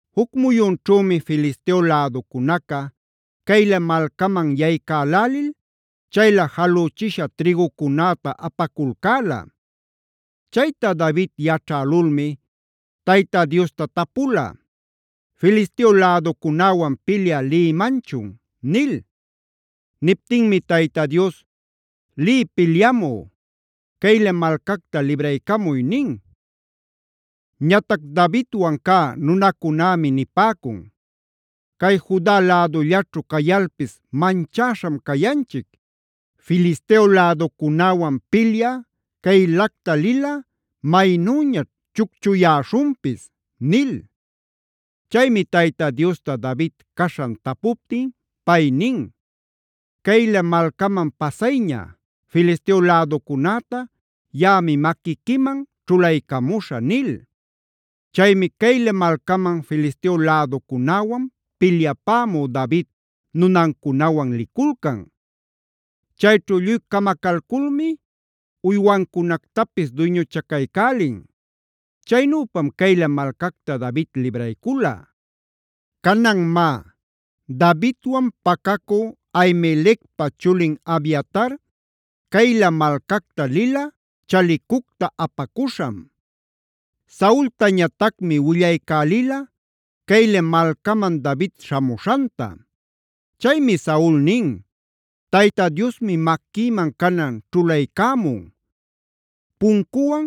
Juc muyunćhümi Filisteo läducunaca Keila malcaman yaycälälil chaylä jalüchisha trïgucunäta apaculcäla. Chayta David yaćhälulmi, Tayta Diosta tapula: “¿Filisteo läducunäwan pilyä lïmanchun?” nil. Niptinmi Tayta Dios: “Liy pilyamü; Keila malcacta libraycamuy” nin. Ñatac Davidwan cä nunacunämi nipäcun: “Cay Juda lädullaćhu cayalpis manchäśham cayanchic. Filisteo läducunäwan pilyä Keilacta lilꞌa maynüñaćh chucchuyäśhunpis” nil. Chaymi Tayta Diosta David caśhan tapuptin pay nin: “Keila malcaman pasayña. Filisteo läducunäta yaꞌami maquiquiman ćhulaycamuśhä” nil. Chaymi Keila malcaman Filisteo läducunäwan pilyapämü David nunancunawan liculcan. Chayćhu lluy camacalculmi uywancunactapis duyñuchacaycälin. Chaynüpam Keila malcacta David libraycula. Canan má, Davidwan pacacü Ahimelecpa chulin Abiatar Keila malcacta lila chalicucta apacuśham. Saultañatacmi willaycälila Keila malcaman David śhamuśhanta. Chaymi Saul nin: “Tayta Diosmi maquïman canan ćhulaycämun. Puncuwan,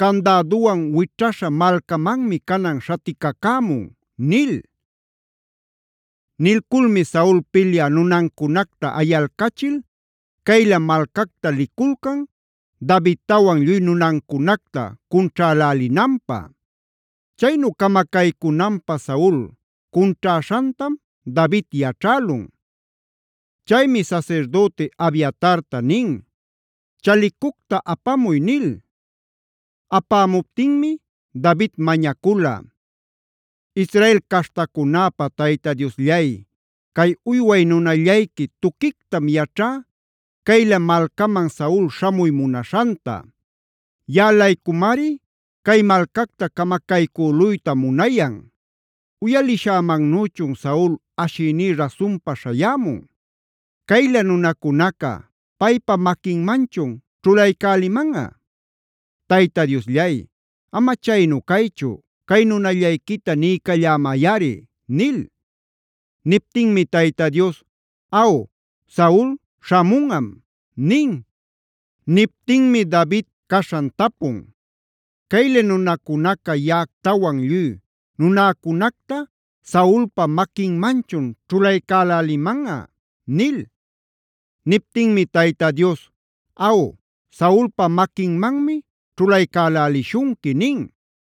candäduwan wićhaśha malcamanmi canan śhaticacämun” nil. Nilculmi Saul pilyä nunancunacta ayalcachil Keila malcacta liculcan Davidtawan lluy nunancunacta cunćhälälinanpä. Chaynu camacaycünanpä Saul cunćhäśhantam David yaćhälun. Chaymi sasirdüti Abiatarta nin: “Chalicucta apamuy” nil. Apämuptinmi David mañacula: “Israel caśhtacunäpa Tayta Diosllay, cay uyway nunallayqui tuquictam yaćhá Keila malcaman Saul śhamuy munaśhanta. Yaꞌa-laycumari cay malcacta camacaycüluyta munayan. ¿Uyalishämannüchun Saul ashïní rasunpa śhayämun? ¿Keila nunacunaca paypa maquinmanchun ćhulaycälälimanꞌa? Tayta Diosllay, ama chaynu caychu cay nunallayquita niycallämayꞌari” nil. Niptinmi Tayta Dios: “Aw, Saul śhamunꞌam” nin. Niptinmi David caśhan tapun: “¿Keila nunacunaca yaꞌactawan lluy nunäcunacta Saulpa maquinmanchun ćhulaycälälimanꞌa?” nil. Niptinmi Tayta Dios: “Aw, Saulpa maquinmanmi ćhulaycälälishunqui” nin.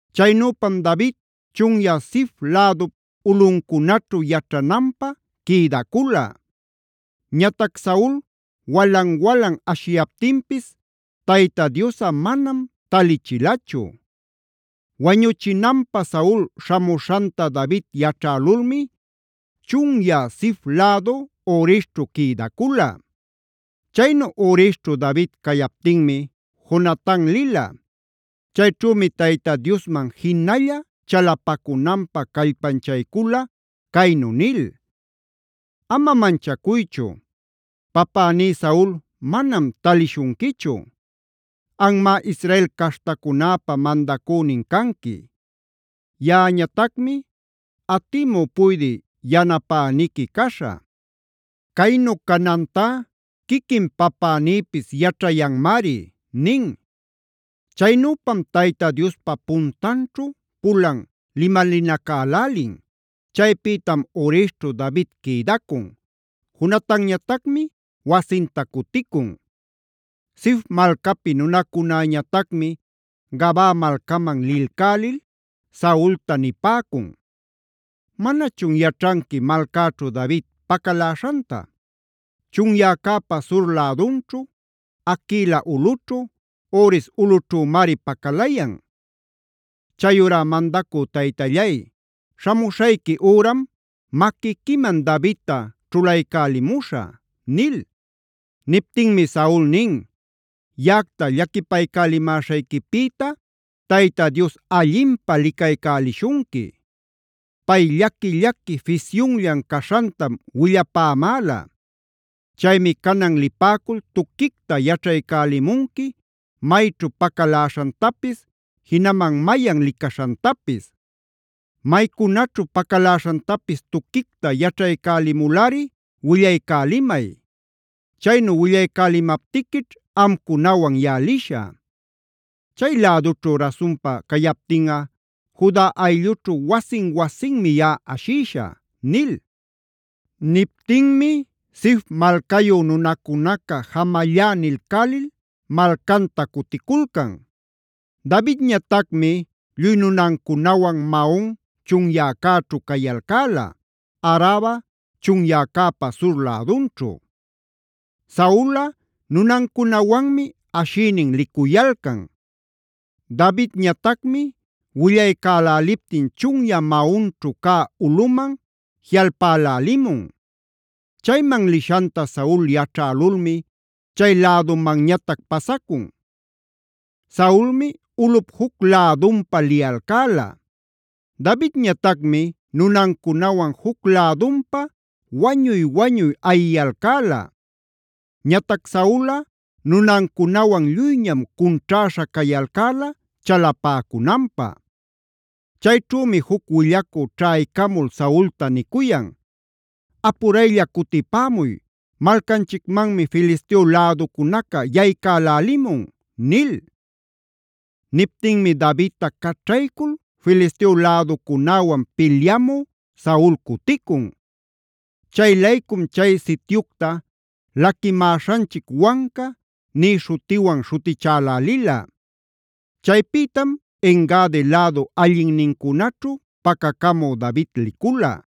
Chaynüpam David chunyä Zif lädup ulꞌuncunaćhu yaćhananpä quïdacula. Ñatac Saul walan-walan ashiyaptinpis Tayta Diosꞌa manam talichilachu. Wañuchinanpä Saul śhamuśhanta David yaćhälulmi chunyä Zif lädu Horesćhu quïdacula. Chaynu Horesćhu David cayaptinmi Jonatan lila. Chayćhümi Tayta Diosman jinalla chalapacunanpä callpanchaycula caynu nil: “Ama manchacuychu; papäní Saul manam talishunquichu. Anmá Israel caśhtacunäpä mandacünin canqui. Yaꞌañatacmi atimü puydï yanapäniqui caśhä. Caynu canantá quiquin papänïpis yaćhayanmari” nin. Chaynüpam Tayta Diospa puntanćhu pulan limalinacälälin.a Chaypïtam Horesćhu David quïdacun; Jonatanñatacmi wasinta cuticun. Zif malcapi nunacunäñatacmi Gabaa malcaman lilcälil Saulta nipäcun: “¿Manachun yaćhanqui malcäćhu David pacaläśhanta?b Chunyäcäpa sur lädunćhu, Haquila ulꞌućhu, Hores ulꞌućhümari pacalayan. Chayurá mandacü taytallay, śhamuśhayqui üram maquiquiman Davidta ćhulaycälimuśhä” nil. Niptinmi Saul nin: “Yaꞌacta llaquipaycälimäśhayquipïta Tayta Dios allinpä licaycälishunqui. Pay llaqui-llaqui fisyunllan caśhantam willapämäla. Chaymi canan lipäcul tuquicta yaćhaycälimunqui mayćhu pacaläśhantapis, jinaman mayan licaśhantapis. Maycunaćhu pacaläśhantapis tuquicta yaćhaycälimulꞌari willaycälimay. Chaynu willaycälimaptiquićh amcunawan yaꞌa lishä. Chay-lädućhu rasunpa cayaptinꞌa Juda ayllućhu wasin-wasinmi yaꞌa ashïshä” nil. Niptinmi Zif malcayu nunacunaca “jamallá” nilcälil malcanta cuticulcan. Davidñatacmi lluy nunancunawan Maon chunyäcäćhu cayalcäla, Araba chunyäcäpa sur lädunćhu. Saulꞌa nunancunawanmi ashïnin licuyalcan. Davidñatacmi willaycäläliptin chunyä Maonćhu cä ulꞌuman jiꞌalpälälimun. Chayman lishanta Saul yaćhälulmi chay lädumanñatac pasacun. Saulmi ulꞌup juc lädunpa liyalcäla. Davidñatacmi nunancunawan juc lädunpa wañuy-wañuy ayiyalcäla. Ñatac Saulꞌa nunancunawan lluyñam cunćhäśha cayalcäla chalapäcunanpä. Chayćhümi juc willacü ćhaycamul Saulta nicuyan: “Apuraylla cutipämuy; malcanchicmanmi Filisteo läducunaca yaycälälimun” nil. Niptinmi Davidta caćhaycul Filisteo läducunäwan pilyamü Saul cuticun. Chay-laycum chay sityucta “Laquimäśhanchic Wanca” nï śhutiwan śhutichälälila. Chaypïtam En-gadi lädu allinnincunaćhu pacacamü David licula.